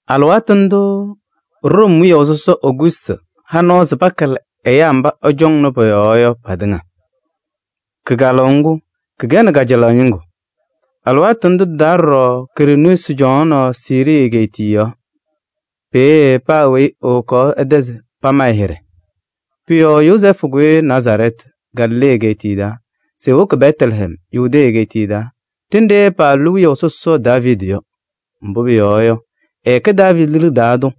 Alɩwaatʋ ndʋʋ Room wiyaʋ sɔsɔ Ogustɩ ha nɔɔ se pakalɩ ɛyaa mba ɛcɔŋnɩ pɔ-yɔɔ yɔ patɩŋa. Kɩkalʋʋ ŋgʋ kɩkɛnɩ kajalaɣ ñɩŋgʋ. Alɩwaatʋ ndʋ tɩ-taa ɖɔɖɔ Kiriiniyuusi cɔŋaɣnɩ Siirii egeetiye yɔɔ. Peeye paa weyi ewokaɣ ɛ-tɛ se pama ɛ-hɩɖɛ. Pʋ-yɔɔ Yozɛɛfʋ kʋyɩ Nazarɛɛtɩ, Galilee egeetiye taa se ewoki Bɛtlɛhɛm, Yudee egeetiye taa ɖenɖe paalʋlɩ wiyaʋ sɔsɔ Daaviidi yɔ. Mbʋ pʋyɔɔ yɔ, ɛkɛ Daaviidi liɖe taa tʋ.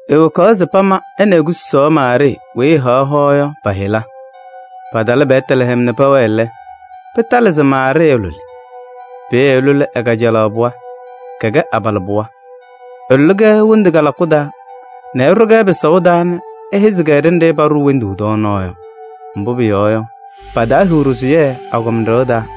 Ewokaɣ se pama ɛ nɛ e-kususaɣ Maarɩɩ weyi ɛhaɣ hoa yɔ pa-yɩla. Patalɩ Bɛtlɛhɛm nɛ pɛwɛɛ lɛ, pɩtalɩ se Maarɩɩ ɛlʋlɩ. Peeye ɛlʋlɩ ɛ-kajalaɣ pɩɣa, kɛkɛ abalɩbɩɣa. Ɛlʋlɩ-kɛ wondu kalakʋ taa nɛ ɛɖʋ-kɛ pɩsaʋ taa nɛ ɛhɛzɩ-kɛ ɖenɖe paɖʋʋ wondu tɔɔnaɣ yɔ. Mbʋ pʋyɔɔ yɔ, pataahiɣ ɖɩsʋyɛ agɔma ɖɩɣa taa.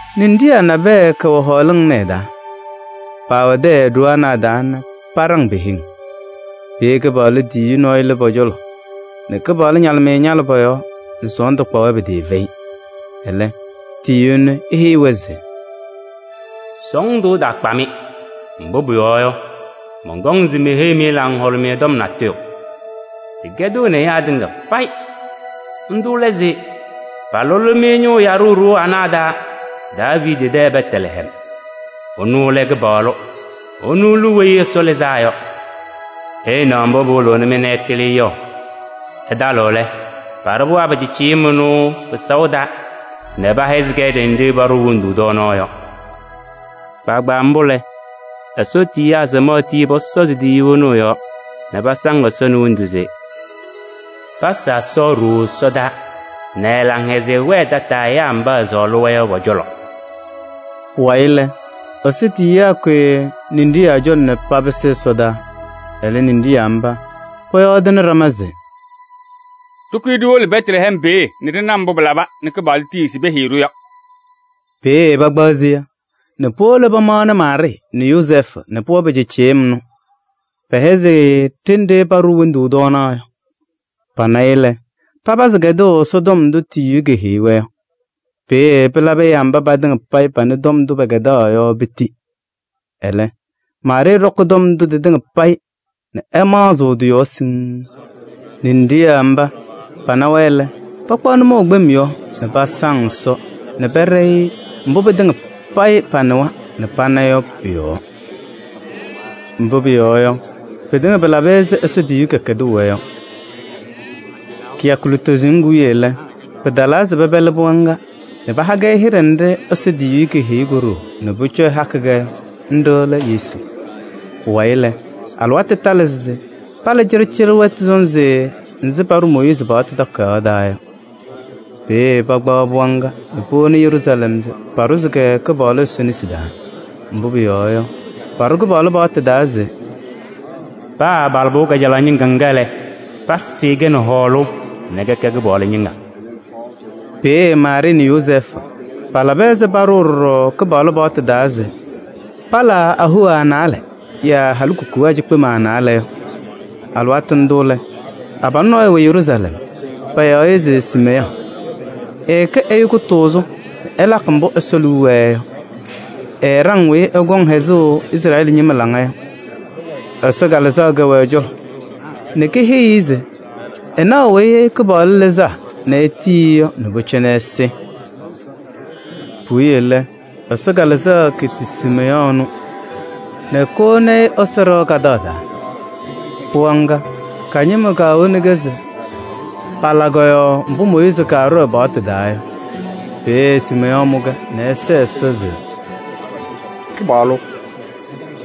Ninɖiɣyaa nabɛyɛ kɛwɛ hɔɔlɩŋ ɩnʋ ɩ-taa. Paawɛ tɛyɛ ɖoo ana a-taa nɛ paɖaŋ pe-heŋ. Peeye Kɩpaɣlʋ tiyiyu nɔɔyʋ lɩ pɔ-cɔlɔ nɛ Kɩpaɣlʋ ñalɩmɩyɛ ñalɩ pɔ-yɔɔ nɛ sɔɔndʋ kpa-wɛ pɩtɩɩfɛyɩ. Ɛlɛ, tiyiyu ɛnʋ eheyi-wɛ se: “Sɔɔndʋ ɛtaakpa-mɩ, mbʋ pʋyɔɔ yɔ, mɔnkɔm se meheyi-mɩ laŋhʋlʋmɩyɛ tɔm natʋyʋ. Tɩkɛdɩɣnɩ ɛyaa tɩŋa payɩ.” Ndʋ lɛ se palʋlɩ-mɩ Ñʋʋ Yaɖʋ ɖoo anɛ a-taa Daaviidi tɛ Bɛtlɛhɛm. Ɛnʋ lɛ Kɩpaɣlʋ, ɛnʋ lɛ Weyi Ɛsɔ Lɩzaa Yɔ. Ɩɩnaɣ mbʋ pɩwɩlɩɣ-mɩ nɛ ɩtɩlɩ yɔ: ɩtalɩɣ lɛ, paɖʋ pɩɣa pɩcɩɩcɩyɩm ɛnʋ pɩsaʋ taa nɛ pɛhɛzɩ-kɛ ɖenɖe paɖʋʋ wondu tɔɔnaɣ yɔ. Kpaagbaa mbʋ lɛ, Ɛsɔ tiyiyaa samaɣ tii pɔsɔzɩ tiyiyu ɛnʋ ɛ-yɔɔ nɛ pasaŋ Ɛsɔ nɛ hendu se: “Pasa Ɛsɔ ɖooo ɛsɔdaa nɛ ɛ-laŋhɛzɩyɛ wɛɛ tataa ɛyaa mba ɛsɔɔlɩ-wɛ yɔ pɔ-cɔlɔ.” Pʋwayɩ lɛ, Ɛsɔ tiyiyaa kʋyɩ ninɖiɣyaa cɔlɔ nɛ papɩsɩ ɛsɔdaa. Ɛlɛ ninɖiɣyaa mba pɔyɔɔdɩnɩ ɖama se: “Ɖɩkʋyɩ ɖiwolo Bɛtlɛhɛm peeye nɛ ɖɩna mbʋ pɩlaba nɛ Kɩpaɣlʋ tiyiɣ se peheyi-ɖʋ yɔ.” Peeye pakpaɣ seya nɛ powolo pamaɣnɩ Maarɩɩ nɛ Yozɛɛfʋ nɛ pɩɣa pɩcɩɩcɩyɩm ɛnʋ. Pɛhɛzɩ-ɩ ɖenɖe paɖʋʋ wondu tɔɔnaɣ yɔ. Pana-ɩ lɛ, papazɩ kɛdʋʋ ɛ-tɔm ndʋ Ɛsɔ tiyiyu keheyi-wɛ yɔ. Peeye pɩlabɩ ɛyaa mba patɩŋa panɩ tɔm ndʋ pɛkɛdaa yɔ piti. Ɛlɛ, Maarɩɩ ɖɔkɩ tɔm ndʋ tɩtɩŋa payɩ nɛ ɛmaɣzɩɣ tɩ-yɔɔ siŋŋ. Ninɖiɣyaa mba pana-wɛ lɛ, pakpaɣ nʋmɔʋ kpem yɔɔ nɛ pasaŋ Ɛsɔ nɛ pɛɖɛyɩɣ-ɩ mbʋ pɩtɩŋa panɩwa nɛ pana yɔ pʋ-yɔɔ. Mbʋ pʋyɔɔ yɔ, pɩtɩŋa pɩlabɩ ɛzɩ Ɛsɔ tiyiyu kɛkɛdʋʋ-wɛ yɔ. Kɩyakʋ lutozo ñɩŋgʋ wiye lɛ, pɩtalaa se pɛpɛlɩ pɩɣa ŋga nɛ paha-kɛ hɩɖɛ nɖɩ Ɛsɔ tiyiyu keheyi ko-ɖoo nɛ pʋcɔ ɛhaɣ-kɛ yɔ: nɖɩ lɛ Yesu. Pʋwayɩ lɛ, alɩwaatʋ talɩ se pala cɩɖɩcɩɖɩ wɛtʋ sɔnzɩ ɛzɩ paɖʋʋ Mooyiizi paɣtʋ taa yɔ. Peeye pakpaɣ pɩɣa ŋga nɛ powoni Yeruusalɛm se paɖʋzɩ-kɛ Kɩpaɣlʋ Ɛsɔ nesi taa. Mbʋ pʋyɔɔ yɔ, paɖʋ Kɩpaɣlʋ paɣtʋ taa se: “Paa abalɩbɩɣa kajalaɣ ñɩŋga ŋga lɛ, pasɩɩ-kɛ nɛ hɔɔlʋʋ nɛ kɛkɛ Kɩpaɣlʋ ñɩŋga.” Peeye Maarɩɩ nɛ Yozɛɛfʋ palaba ɛzɩ paɖʋʋ ɖɔɖɔ Kɩpaɣlʋ paɣtʋ taa se palaa ahoa naalɛ yaa halikukunaa cikpema naalɛ yɔ. Alɩwaatʋ ndʋ lɛ, abalʋ nɔɔyʋ wɛ Yeruusalɛm, payaɣ-ɩ se Siimeyɔɔ. Ɛɛkɛ ɛyʋ kʋtʋʋzʋ nɛ ɛlakɩ mbʋ Ɛsɔ liu wɛɛ yɔ. Ɛɛɖaŋ weyi ɛkɔŋ hɛzʋʋ Izrɛɛlɩ ñɩma laŋa yɔ. Ɛsɔ Kalɩzaɣ kɛwɛ ɛ-cɔlɔ nɛ keheyi-i se ɛnaɣ Weyi Kɩpaɣlʋ Lɩzaa nɛ etiyi-i yɔ nɛ pʋcɔ ɛsɩ. Puwiye lɛ, Ɛsɔ Kalɩzaɣ keti Siimeyɔɔ ɛnʋ nɛ kowoni-i Ɛsɔ ɖɩɣa taa. Pɩɣa caa nɛ ko-ɖoo powoni-kɛ se pala kɔ-yɔɔ mbʋ Mooyiizi kaɖʋ ɛ-paɣtʋ taa yɔ. Peeye Siimeyɔɔ mʋ-kɛ nɛ ɛsɛɛ Ɛsɔ se: “Kɩpaɣlʋ!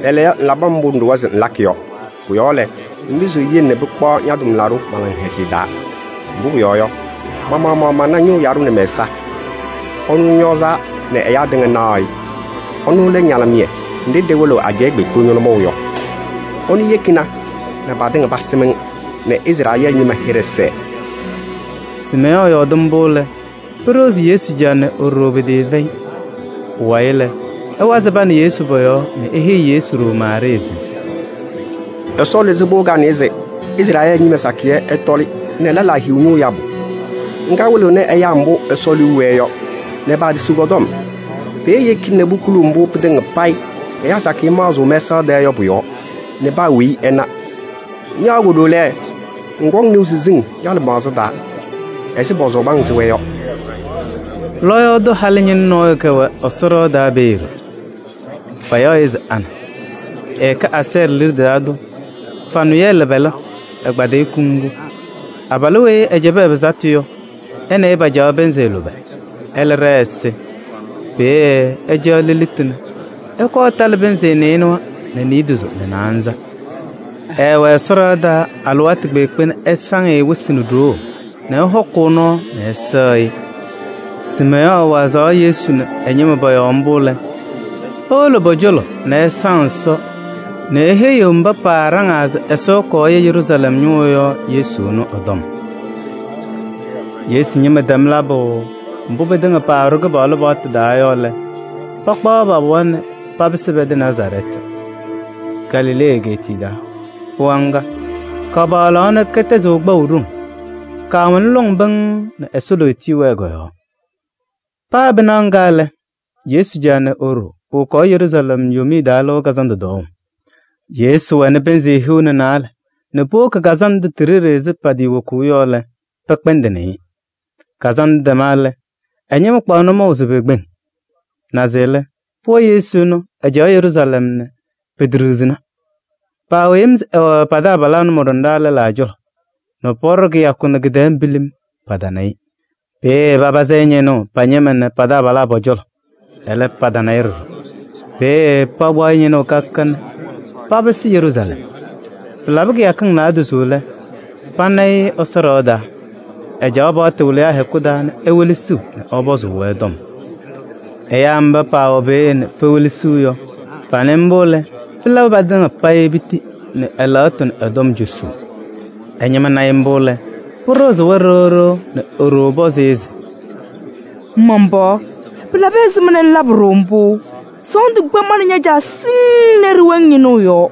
Lɛɛlɛɛyɔ ŋlabɩ mbʋ ŋɖʋwa se ŋlakɩ yɔ. Pʋ-yɔɔ lɛ, ŋpɩzɩɣ ŋyele nɛ pɩkpaɣ ña-tʋmlaɖʋ ma laŋhɛzɩyɛ taa. Mbʋ pʋyɔɔ yɔ, ma-maɣmaɣ mana Ñʋʋ Yaɖʋ nɛ mɛ-ɛza, ɛnʋ ŋñɔɔzaa nɛ ɛyaa tɩŋa naɣ-ɩ. Ɛnʋ lɛ ñalɩmɩyɛ nɖɩ ɖɩwɩlɩɣ ajɛɛ kpeekpe nʋmɔʋ yɔ. Ɛnʋ yekina nɛ patɩŋa pasɩm-ŋ nɛ Izrɛɛlɩ ñɩma hɩɖɛ sɛɛ.” Siimeyɔɔ yɔɔdɩ mbʋ lɛ, pɩɖɩɣzɩ Yesu caa nɛ e-ɖoo pɩtɩɩfɛyɩ. Pʋwayɩ lɛ, ɛwazɩ pa nɛ Yesu pɔ-yɔɔ nɛ eheyi Yesu ɖoo Maarɩɩ se: “Ɛsɔ lɩzɩ pɩɣa kanɛ se Izrɛɛlɩ ñɩma sakɩyɛ ɛtɔlɩ nɛ lɛlaa hiɣ ñʋʋ yabʋ. Ŋga wɩlɩɣnɩ ɛyaa mbʋ Ɛsɔ liu wɛɛ yɔ nɛ paatisiɣ kɔ-tɔm. Peeye eyeki nɛ pukuli mbʋ pɩtɩŋa payɩ ɛyaa sakɩyɛ maɣzɩɣ mɛsaɣ tɛɛ yɔ pʋ-yɔɔ nɛ paa weyi ɛna. Ña ko-ɖoo lɛ, ŋkɔŋ nɩʋ siziŋ ña-lɩmaɣza taa ɛzɩ pɔsɔbɩ-ŋ sɩɣa yɔ.” Lɔɔyaɣ tʋ halɩñɩnʋ nɔɔyʋ kɛwɛ Ɛsɔ ɖɩɣa taa peeye ɖɔɖɔ. Payaɣ-ɩ se Ana. Ɛkɛ Asɛɛrɩ liɖe taa tʋ Fanʋyɛɛlɩ pɛlɛ, ɛkpadɩyɩ kuŋgu. Abalʋ weyi ɛɛcɛbɩ ɛ-pɩsatʋ yɔ, ɛ nɛ ɩ pacaɣ pɩnzɩ lʋbɛ lɛ, ɛlɛ ɖɛɛ ɛsɩ. Peeye ɛcaɣ lelitu nɛ ɛkɔɔ ɛtalɩ pɩnzɩ nɩɩnʋwa nɛ niidozo nɛ naanza. Ɛɛwɛ Ɛsɔ ɖɩɣa taa alɩwaatʋ kpeekpe nɛ ɛsaŋ-ɩ wɩsɩ nɛ ɖoo nɛ ɛhɔkʋʋ nɔɔ nɛ ɛsɛɣ-ɩ. Siimeyɔɔ wazaɣ Yesu nɛ ɛ-ñɩma pɔ-yɔɔ mbʋ lɛ, ewolo pɔ-cɔlɔ nɛ ɛsaŋ Ɛsɔ nɛ eheyiɣ mba paaɖaŋaa se Ɛsɔ ɛkɔɔ ɛya Yeruusalɛm ñʋʋ yɔ Yesu ɛnʋ ɛ-tɔm. Yesu ñɩma tɛm labʋ mbʋ pɩtɩŋa paɖʋ Kɩpaɣlʋ paɣtʋ taa yɔ lɛ, pakpaɣ pa-pɩɣa nɛ papɩsɩ pɛ-tɛ Nazarɛɛtɩ, Galilee egeetiye taa. Pɩɣa ŋga, kapaɣlaɣ nɛ kɛtɛzɩɣ kpaʋ ɖoŋ. Kaawɛnɩ lɔŋ pɩŋŋ nɛ Ɛsɔ lootiye wɛɛ kɔ-yɔɔ. Paa pɩnaɣ ŋga lɛ, Yesu caa nɛ e-ɖoo powokaɣ Yeruusalɛm Yomiye Taa Lɩʋ Kazandʋ tɔɔʋ. Yesu wɛnɩ pɩnzɩ hiu nɛ naalɛ nɛ powoki kazandʋ ndʋ ti-ɖeɖe ɛzɩ patɩɩwokuu yɔ lɛ, pɛkpɛndɩnɩ-ɩ. Kazandʋ tɛma lɛ, ɛ-ñɩma kpaɣ nʋmɔʋ se pekpeŋ. Naze lɛ, pɩɣa Yesu ɛnʋ, ɛcaɣ Yeruusalɛm nɛ peteɖiɣzina. Paawɛ yem se ɛwɛ pa-taabalaa nʋmɔɖɔnaa lɛlaa cɔlɔ nɛ pɔɖɔ kɩyakʋ nɛ kɩ-tɛɛ pilim, patana-ɩ. Peeye papazɩ-ɩ ñɩnʋʋ pa-ñɩma nɛ pa-taabalaa pɔ-cɔlɔ. Ɛlɛ, patana-ɩ ɖɔɖɔ. Peeye pakpaɣ-ɩ ñɩnʋʋ ka ka ka nɛ papɩsɩ Yeruusalɛm. Pɩlabɩ kɩyakɩŋ naadozo lɛ, pana-ɩ Ɛsɔ ɖɩɣa taa. Ɛcaɣ paɣtʋ wɩlɩyaa hɛkʋ taa nɛ ewelesiɣ nɛ ɛpɔzʋʋ-wɛ tɔm. Ɛyaa mba paawɛ peeye nɛ pewelesiɣ yɔ, panɩ mbʋ lɛ, pɩla patɩŋa piti nɛ ɛ-lɛɣtʋ nɛ ɛ-tɔm cosuu. Ɛ-ñɩma na-ɩ mbʋ lɛ, pɩɖɩɣzɩ-wɛ ɖɩɣ ɖɩɣ nɛ e-ɖoo pɔzɩ-ɩ se: “Man-pɩɣa! Pɩlabɩ ɛzɩma nɛ ŋlabɩ-ɖʋ mbʋ? Sɔɔndʋ kpa ma nɛ ña-caa siŋŋ nɛ ɖɩwɛ-ŋ ñɩnʋʋ yɔɔ.”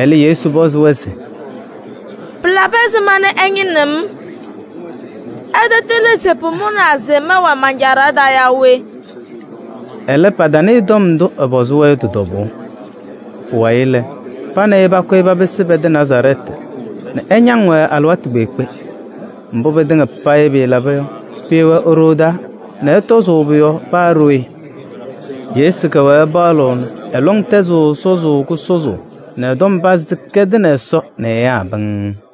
Ɛlɛ, Yesu pɔzɩ-wɛ se: “Pɩlabɩ ɛzɩma nɛ ɩñɩnɩɣ-m? Ɩtatɩlɩ se pʋmʋnaa se mɛwɛɛ man-Caa ɖɩɣa taa yaa we?” Ɛlɛ, patanɩɩ tɔm ndʋ ɛpɔzɩ-wɛ yɔ tɩ-tɔbʋʋ. Pʋwayɩ lɛ, pa nɛ ɩ pakʋyɩ papɩsɩ pɛ-tɛ Nazarɛɛtɩ nɛ ɛñaŋ-wɛ alɩwaatʋ kpeekpe. Mbʋ pɩtɩŋa payɩ pɩlaba yɔ, pʋwɛɛ e-ɖoo taa nɛ ɛtɔzʋʋ pʋ-yɔɔ paa ɖooye. Yesu kɛwɛɛ ɛpaɣlɩɣ nɛ ɛ-lɔŋ tɛzɩɣ sɔzʋʋ kʋsɔzʋʋ nɛ ɛ-tɔm pazɩ tɩkɛdɩnɩ Ɛsɔ nɛ ɛyaa pɩŋŋ.